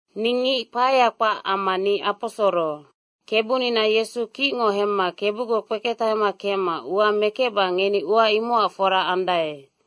Ni ngic kpaea kpac amma ni aposoro. Kebunina Yesu kicngo hemma Kebugoc kpeketahema kecma ua mekecba ngeni ua imocac fora andae.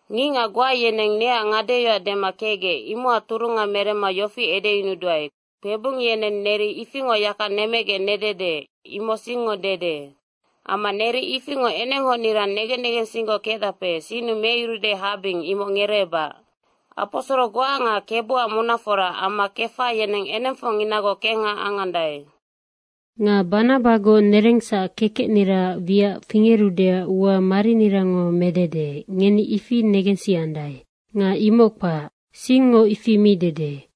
Ngicngac goa yeneng neac ngadeyoac dema kecgec imocac turunga meremma yofi edeyunuduae, kpebung yeneng neri ifingoc yaka nemecgec nedede, imoc singngo dede. Amma neri ifingoc enenghocnira negen negensinggoc kecdape, sinnu meyurude habing, imoc ngereebac. Aposoro goa nga Kebuac munafora amma Kefa, yeneng enengfocnginagoc kengha angandae. Nga Banabagoc nerengsac kekecniraac wiac fingerudeac ua marinirango medede, ngeni ifi negensiandae. Nga imoc kpac, singngo ifi mi dede.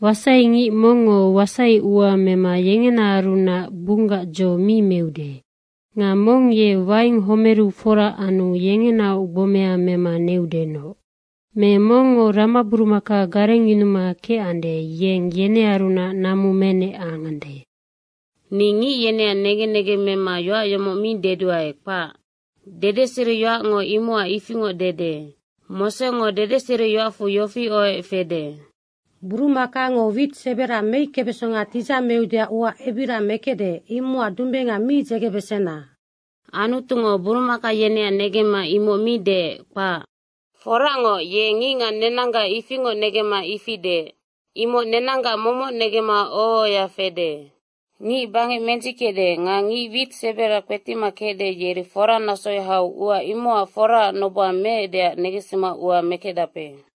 Wasai ngic mongngo wasaiua mema yengenaarunac bunggac dzo mi meude. Nga mong ye waing homeru fora anu yengenaoc gbomea mema neudenoc. Me mongngo ramaburumaka garengyunuma kecande, yeng yenearunac namu menec angande. Ni ngic yeneac negen negeng mema yoac yomoc mi deduae, kpac. Dedeseriyoacngo imocac ifingoc dede. Mosengo dedeseriyoacfu yofi ohoec fede, “Burumakango wit sebera meickebesonga tidzameudeac ua ebiria mekecde, imocac dumbenga mi dzegebesena.” Anutungo burumaka yeneac negemma imoc mi deec, kpac. Foracngoc, ye ngicngac nenanggac ifingoc negemma ifi deec. Imoc nenanggac momoc negemma oho ohoya fede. Ngic bangec mendzickecde nga ngic wit sebera kpetima kecde, yeri fora nasoya hau ua imocac foraac noboha meecdeac negensima ua mekecdape.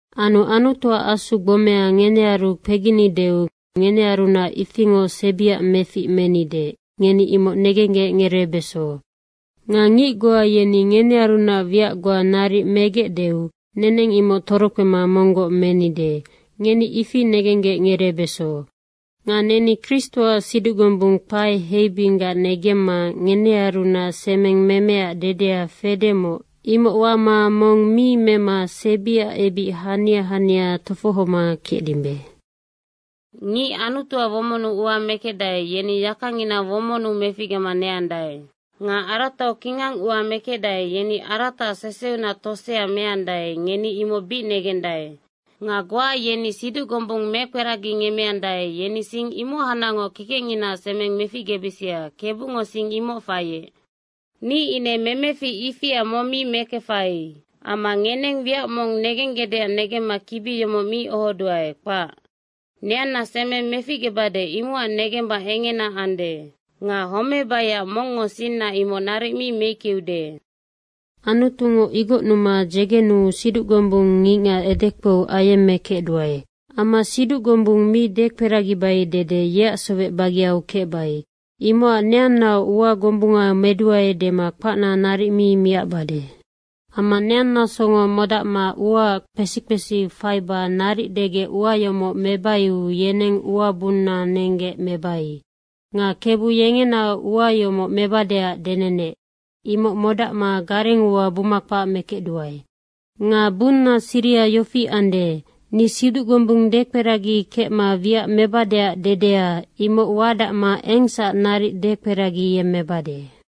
Anu Anutuac Asuac gbome ngenearu kpeginideu ngenearunac ifingoc sebiac mefic menide, ngeni imoc negenggec ngereebeso. Nga ngic goa yeni ngenearunac wiac goa naric megecdeu neneng imoc torokpema monggoc menide, ngeni ifi negenggec ngereebeso. Nga neni Kristoac siduc gombung kpae heibinggac negemma ngenearunac semeng memeac dede fedemoc, imoc wama mong mi mema sebiac ebic hania hania tofohoma kecdimbe. Ngic Anutuac womonnu ua mekecdae, yeni yakangina womonnu meficgema neandae. Nga aratau kingang ua mekecdae, yeni arataac seseunac tosea meandae, ngeni imoc bic negendae. Nga goa yeni siduc gombung mekperagingemmeandae, yeni sing imohacnacngoc kekecnginaac semeng meficgebisia, Kebungo sing imoc faiec. Ni ine memefic ifia mong mi mekefai. Amma ngeneng wiac mong nenggecdeac negemma kibi yomoc mi ohoduae, kpac. Neanna semeng meficgebade, imocac negemba engena ande. Nga homebaiac mongngo sinna imoc naric mi meickeude. Anutungo igocnuma dzegenuu siduc gombung ngicngac edekpou ayemmekecduae. Amma siduc gombung mi dekperagibai dede yeac sowec bageau kecbai. Imocac neannaoc ua gombunga meduae dema kpacna naric mi miacbade. Amma neanna songo modacma uaac kpesi kpesi faiba naric degec ua yomoc mebaiu yeneng uabung nenggec mebai. Nga Kebu yengenaoc ua yomoc mebadeac denenec, imoc modacma garengua buma kpac mekecduae. Nga bunna siriha yofi ande, ni siduc gombung dekperagikecma wiac mebadeac dedea, imoc wadacma engsac naric dekperagiyemmebade.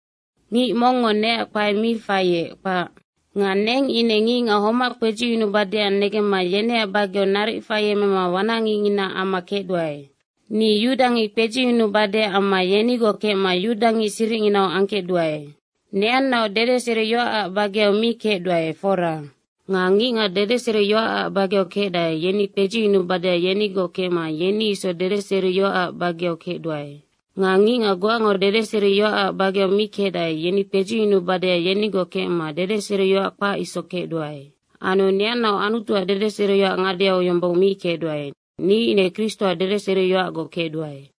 Ngic mongngo neac kpae mi faiec, kpac. Nga neng ine ngicngac homac kpedziyunubadeac negemma yeneac bageu naric faiemema wanacngicngina amma kecduae. Ni yudangic kpedziyunubadeac amma yenigoc kecma yudangic siricnginau angkecduae. Neannaoc dedeseriyoacac bageu mi kecduae, fora. Nga ngicngac dedeseriyoacac bageu kecdae, yeni kpedziyunubadeac yenigoc kecma yeni isoc dedeseriyoacac bageu kecduae. Nga ngicngac goango dedeseriyoacac bageu mi kecdae, yeni kpedziyunubadeac yenigoc kecma dedeseriyoac kpac isoc kecduae. Anu neannaoc Anutuac dedeseriyoac ngadeau yombong mi kecduae, ni ine Kristoac dedeseriyoacgoc kecduae.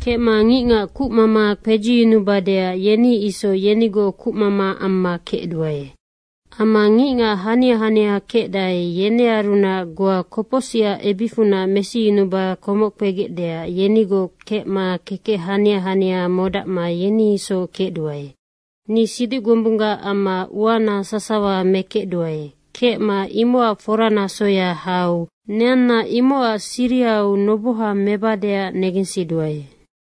Kecma ngicngac kucmama kpedziyunubadeac yeni isoc yenigoc kucmama amma kecduae. Amma ngicngac hania hania kecdae, yenearunac goa kopocsicac ebicfunac mesiyunuba komoc kpegecdeac yenigoc kecma kekec hania hania modacma yeni isoc kecduae. Ni siduc gombunggac amma uana sasawa mekecduae, kecma imocac fora nasoya hau neanna imocac sirihau noboha mebadeac negensiduae.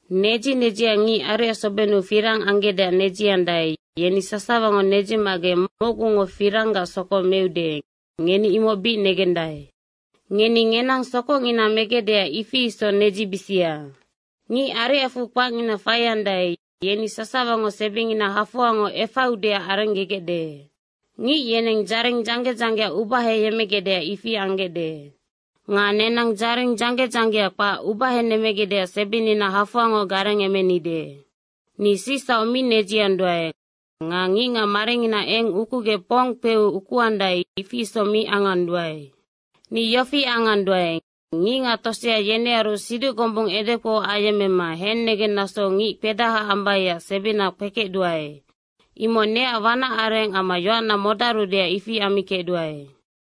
Nedzi nedziac ngic ariacsobennu firang anggecdeac nedziandae, yeni sasawango nedzimagec mocgungo firanggac sokoc meude, ngeni imoc bic negendae. Ngeni ngenang sokocngina megecdeac ifi isoc nedzibisia. Ngic ariacfu kpacngina faiandae, yeni sasawango sebingina hafoangoc efaiudeac arengegecde. Ngic yeneng dzaring dzangge dzanggea ubaheyemmegecdeac ifi anggecde. Nga nenang dzaring dzangge dzanggea kpac ubahenemmegecdeac sebinina hafoangoc garengemenide. Ni sicsauc mi nedzianduae nga ngicngac maringina eng ukugec pong kpeu ukuandae, ifi isoc mi anganduae. Ni yofi anganduae, ngicngac tosea yenearu siduc gombung edekpou ayemmema hennegeng nasou ngic kpedaha ambaiac sebina kpekecduae. Imoc neac wanac areng amma yoacna modarudeac ifi ammikecduae.